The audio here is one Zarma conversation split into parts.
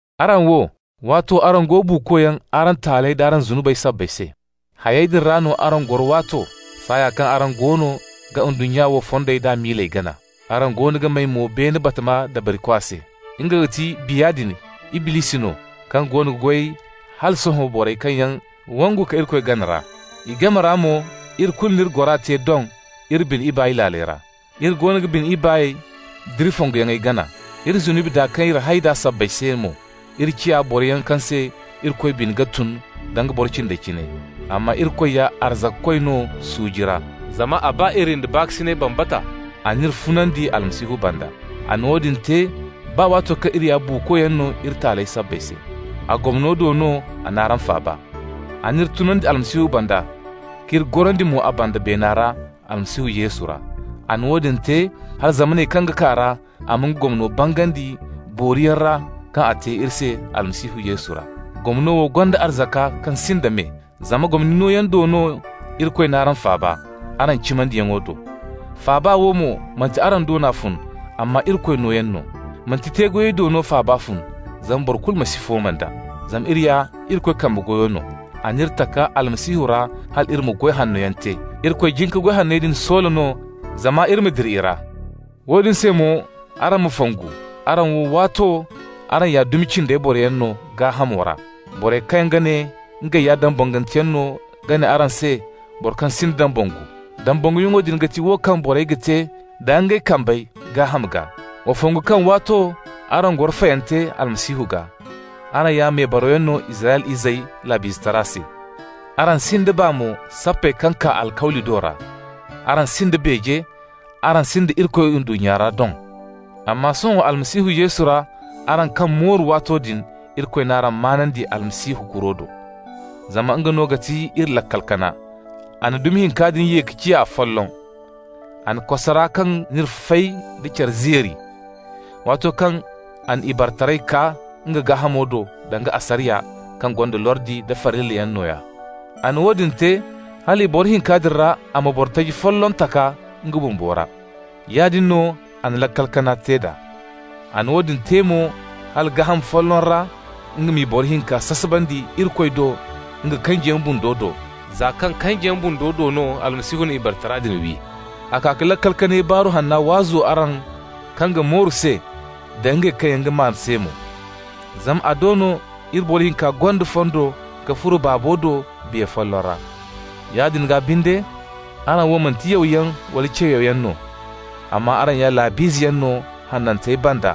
Araŋ wo, waato araŋ go buukoyaŋ araŋ taaley d'araŋ zunubey sabbay se. Hayey din ra no araŋ goro waato, saaya kaŋ araŋ goono ga ndunnya wo fondey d'a miiley gana. Araŋ goono ga may mo beene batama dabarikwa se. Nga ga ti biya din (Iblisi no) kaŋ goono ga goy hala sohõ borey kaŋ yaŋ wangu ka Irikoy gana ra. I game ra mo iri kulu n'iri gora te doŋ, iri bine ibaay laaley ra. Iri goono ga bine ibaay d'iri fonguyaŋey gana. Iri zunubi daa kaŋ iri hay d'a sabbay se mo iri ciya boroyaŋ kaŋ se Irikoy bine ga tun, danga boro cindey cine. Amma Irikoy ya arzakakoy no suuji ra. Zama a ba iri nda baakasinay bambata, a n'iri funandi Almasihu banda. A na woodin te baa waato kaŋ iri ya buukoyaŋ no iri taaley sabbay se. (A gomno do no a n'araŋ faaba.) A n'iri tunandi Almasihu banda k'iri gorandi mo a banda beena ra Almasihu Yesu ra. A na woodin te hala zamaney kaŋ ga kaa ra a ma nga gomno bangandi booriyaŋ ra kaŋ a te iri se Almasihu Yesu ra. Gomno wo gonda arzaka kaŋ sinda me. Zama gomni nooyaŋ do no Irikoy n'araŋ faaba, araŋ cimandiyaŋo do. Faaba wo mo, manti araŋ do no a fun, amma Irikoy nooyaŋ no. Manti te-goyey do no faaba fun, zama boro kulu ma si fooma nd'a. Zama iri ya Irikoy kambe goyo no. A n'iri taka Almasihu ra hal iri ma goy hannoyaŋ te. Irikoy jin ka goy hanney din soola no zama iri ma dira i ra. Woodin se mo araŋ ma fongu: araŋ wo, waato araŋ ya dumi cindey boroyaŋ no gaahamo ra. Borey kaŋ ga ne ngey ya dambanganteyaŋ no ga ne araŋ se borey kaŋ yaŋ si dambangu. Dambanguyaŋo din ga ti wo kaŋ borey ga te da ngey kambey gaaham gaa. Wa fongu kaŋ waato araŋ goro fayante Almasihu gaa. Araŋ ya mebarawyaŋ no Israyla izey laab'izetara se. Araŋ sinda baa mo sappey kaŋ kaa alkawli do ra. Araŋ sinda beeje, araŋ sinda Irikoy ndunnya ra doŋ. Amma sohõ Almasihu Yesu ra araŋ kaŋ mooru waato din, Irikoy n'araŋ maanandi Almasihu kuro do. Zama nga no ga ti iri laakal kana. A na dumi hinka din ye ka ciya afolloŋ. A na kosara kaŋ n'iri fay da care zeeri, waato kaŋ a na ibaretaray kaa nga gaahamo do, danga asariya kaŋ gonda lordi da farillayaŋ nooya. A na woodin te hal i boro hinka din ra a ma boro taji folloŋ taka nga bumbo ra. Yaadin no a na laakal kana te d'a. A na woodin te mo hala gaaham folloŋ ra nga m'i boro hinka sasabandi Irikoy do nga kanjiyaŋ bundo do, za kaŋ kanjiyaŋ bundo do no Almasihu na ibaretara din wi. A kaa ka laakal kanay Baaru Hanna waazu araŋ kaŋ ga mooru se da ngey kaŋ yaŋ ga maan se mo. Zama a do no iri boro hinka gonda fondo ka furo Baabo do Biya folloŋ ra. Yaadin gaa binde, araŋ wo manti yawyaŋ wala ce-yawyaŋ no, amma araŋ ya laab'izeyaŋ no hanantey banda,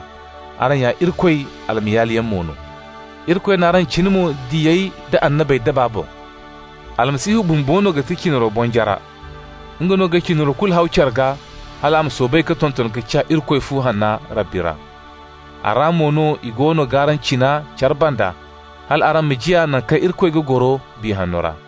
araŋ ya Irikoy almayaaliyaŋ mo no. Irikoy n'araŋ cina mo diyey da annabey daba boŋ. Almasihu bumbo no ga ti cinaro bonjara. Nga no ga cinaro kulu haw care gaa hal a ma soobay ka tonton ka ciya Irikoy fu hanna Rabbi ra. A ra mo no i goono g'araŋ cina care banda hal araŋ ma ciya naŋ kaŋ Irikoy ga goro Biya Hanno ra.